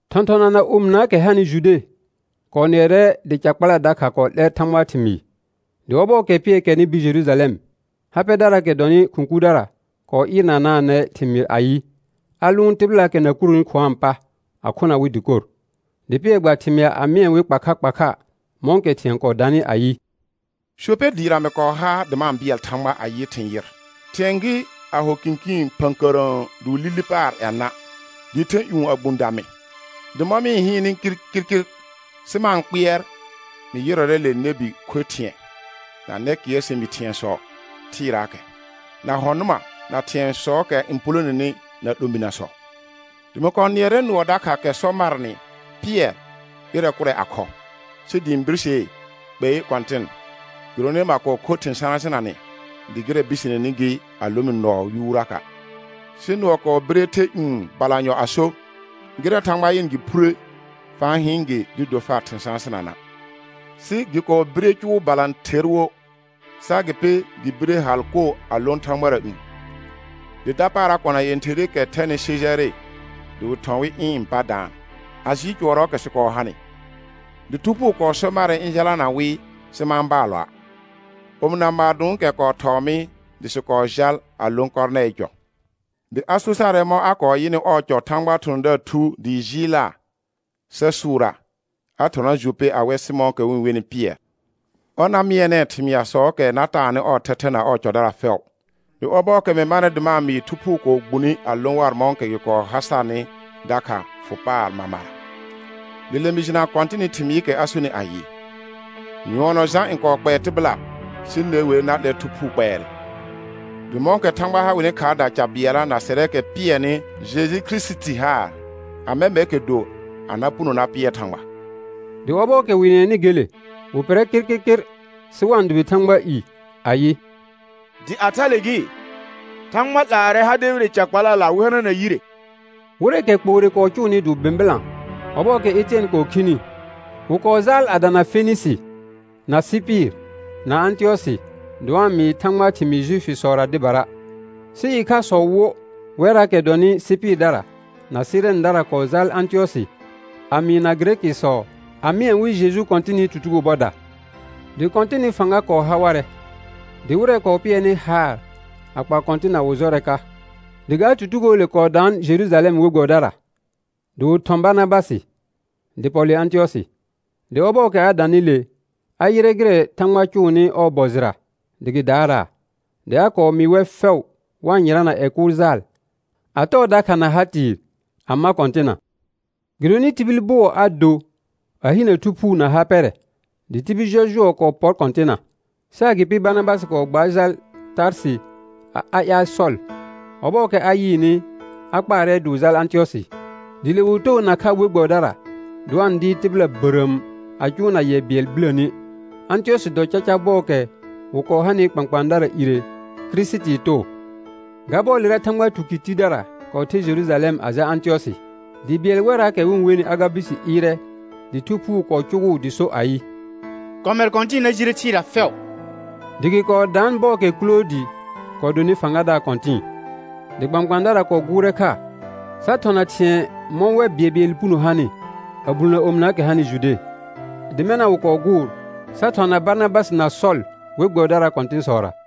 Thɔ̃thɔna na omɩnaakɛ hanɩ Jude kɔɔ nɩɛrɛ dɩ ca kpala dakha kɔɔ 'lɛr Thãgbaa thɩmɩɩ. Dɩ ɔbɔɔkɛ Pɩɛr kɛrnɩ bir Jerujalɛm, ha pɛdaraakɛ dɔnɩ khʋ̃ kurdara kɔɔ ɩɩrnanaanɛ thɩmɩɩr ayɩ, a lʋʋn tɩbɩlaakɛ na kuroni khʋ̃aa pa, a khona wɩ dɩkor. Dɩ Pɩɛr gba thɩmɩa a mɩɛ wɩ kpa kha kpa kha, mɔ̃kɛ thɩ̃ɛ kɔɔ danɩ ayɩ: Jope dɩɩra mɩ kɔɔ ha dɩ ma-n bɩɛl Thãgba a yɩ thɩ̃ yɩr; ɩhɩ̃ɛ gɩ a ho kɩ̃kɩɩn phə̃kərə̃ə dɩ wɩ li li paar yenã, dɩɩ the ƴũ a gbũ dã mɩ. Dɩ mɔ̃ mɩ-n hɩɩnnɩ kirkirkir sɩ ma-n kpɩɛr, mɩ yɩrɔrɛ le nɛbi kho thɩ̃ɛ, na nɛkɩɛr sɛ̃bi thɩ̃ɛsɔ thɩɩraakɛ, na hɔ̃ nʋma, na thɩ̃ɛsɔɔkɛ n puuloneni, na 'lominəsɔ. Dɩ mɩ nɩɛrɛ nʋɔ dakha kɛ sɔ marnɩ: Pɩɛr, ɩrɛ kʋrɛ a khɔ. Sɩ dɩ ɩ̃ birsee: Kpei Kɔ̃tɩn, gɩdonɩ ma kɔɔ kho thɩ̃ sãsɩnanɛ dɩ gɩrɛ biseneni gɩ a lõ mɩ nɔɔ yuuraka'. Sɩ nʋɔ kɔɔ bire the ƴũ balanyɔ a so: Gɩrɛ Thãgba yɩnɩ gɩ phure, fa-n hɩɩn gɩ dɩɩ do far thɩ̃ sãsɩnana'. Sɩ gɩ kɔɔ bire cʋʋ balãther wo, sɩ agɩpɩ gɩ bire hal koo a lõ thãgbara ƴũ. Dɩ dapaara kona yẽtherɩkɛ thɛnɩ Sejare dɩ wɩ thɔ̃ wɩ ɩ̃ pa daan, a jɩɩl cʋɔrɔɔkɛ sɩ kɔɔ hanɩ. Dɩ Thu Phuu kɔɔ so marɛ ɩ̃ jalana wɩ sɩ ma-n baalɔa'. Omɩna maadõokɛ kɔɔ thɔɔ mɩ dɩ sɩ kɔɔ jal a lõ Kɔrnɛɩɩ cɔ. Dɩ a so sarɛ mɔ̃ a kɔɔ yɩnɩ ɔɔ cɔ Thãgbaa thɔ̃thɔ̃daar thu dɩ jɩɩlaa sa sʋʋraa, a thɔna Jope a wɛ Sɩmɔ̃ɔkɛ wɩ-n wenɩ Pɩɛr, ɔr na mɩɛnɛɛ thɩmɩasɔɔkɛ na taanɩ ɔɔ thɛthɛ na ɔɔ cɔdara fɛʋ. Dɩ ɔbɔɔkɛ mɩ manɩ dɩ ma-n mɩɩ, Thu Phuu kɔɔ gbune a lõ war mɔ̃kɛ gɩ kɔɔ ha sarnɩ dakha fʋ paar mamara. Dɩ le mɩ jɩna Kɔ̃tɩnɩ thɩmɩɩkɛ a sonɩ ayɩ: Nyʋɔnɔ Jã n kɔɔ kpɛɛ tɩbɩla, sɩ ne wer na 'lɛr Thu Phuu kpɛɛrɛ. Dɩ mɔ̃kɛ Thãgba ha wɩnɩ khaarda ca bɩɛlla na sɛrɛɛkɛ pɩɛrnɩ Jeju Kirisiti haar, amɛ mɛrkɛ do a na puno na pɩɛr Thãgba? Dɩ ɔbɔɔkɛ wɩ nɩɛnɩ gele, wɩ pɩrrɛ kɩrkɩrkɩr sɩ wa-n dʋbɩ Thãgbaa i ayɩ: Dɩ a thale gɩ, Thãgba 'laarɛ ha debire ca kpalala wɩ hanana yire. Wɩrɛɛkɛ kpoore kɔɔ cʋʋnɩ dɩ wɩ bɩ̃bɩlã ɔbɔɔkɛ Etɩɛn kɔɔ khini, wɩ kɔɔ jaal a dana Fenɩsɩ, na Sɩpɩr, na Ãtɩyɔsɩ, dɩ wa-n mɩɩ Thãgbaa thɩmɩɩ Juifisɔra dɩbara. Sɩ ɩkhasɔ wo wɛrraakɛ dɔnɩ Sɩpɩrdara na Sɩrɛndara kɔɔ jaal Ãtɩyɔsɩ a mɩɩna Gɩrɛkɩsɔ a mɩɛ wɩ Jeju Kɔ̃tɩnɩ tutugo bɔda. Dɩ Kɔ̃tɩnɩ fãga kɔɔ ha warɛ, dɩ wɩrɛ kɔɔ pɩɛrnɩ haar a kpa Kɔ̃tɩnna wɩ jɔrɛ ka. Dɩ ga tutugoole kɔɔ daan Jerujalɛm we gbɛbɩdara, dɩ wɩ thɔ̃ Barnabasɩ. dɩ pɔ le Ãtɩyɔsɩ. Dɩ ɔbɔɔkɛ a danɩ le, a yɩrɛ gɩrɛ Thãgba cʋʋnɩ ɔɔ bɔ jɩra dɩ gɩ daaraa, dɩ a kɔɔ mɩɩ wɛr fɛʋ wa-n yɩrana ƴɛ kʋʋl jaal a tɔɔ dakha na ha tɩɩ a ma Kɔ̃tɩnna. Gɩdonɩ tibil bʋɔ a do a hinə Thu Phuu na ha pɛrɛ, dɩ tibil jɔjʋɔ kɔɔ pɔr Kɔ̃tɩnna. Sɩ agɩpɩ Barnabasɩ kɔɔ gbaar jal Tarsɩ a ƴaal Sɔl; ɔbɔɔkɛ a yɩɩnɩ, a kpaarɛ dɩ wɩ jal Ãtɩyɔsɩ. Dɩ le wɩ too nakha we gbɛbɩdara dɩ wa-n dɩɩr tɩbɩla bərəəm a cʋʋna yɛ bɩɛl biləni; Ãtɩyɔsɩ dɔ caca bɔɔkɛ wɩ kɔɔ hanɩ kpãkpãadara ire Kirisitii too. Ga bɔɔlera Thãgba tukɩr tidara kɔɔ ther Jerujalɛm a jal Ãtɩyɔsɩ. Dɩ bɩɛl wɛrraakɛ wɩ-n wenɩ Agabusi ɩɩrɛ dɩ Thu Phuu kɔɔ cʋgʋʋ dɩ so ayɩ: Kɔmɛ kɔ̃tɩ̃ɩ na jire thɩɩra fɛʋ. Dɩ gɩ kɔɔ daan bɔɔkɛ Kʋloodɩ kɔɔ dɔnɩ fãgadaar kɔ̃tɩ̃ɩ. Dɩ kpãkpãadara kɔɔ gʋʋrɛ kha, sa thɔna thɩ̃ɛ mɔ̃ wɛr bɩɛlbɩɛlɩ puno hanɩ a bulnə omɩnaakɛ hanɩ Jude. Dɩ mɛna wɩ kɔɔ gʋʋr sa thɔna Barnabasɩ na Sɔl we gbɛbɩdaraa kɔ̃tɩ̃sɔra.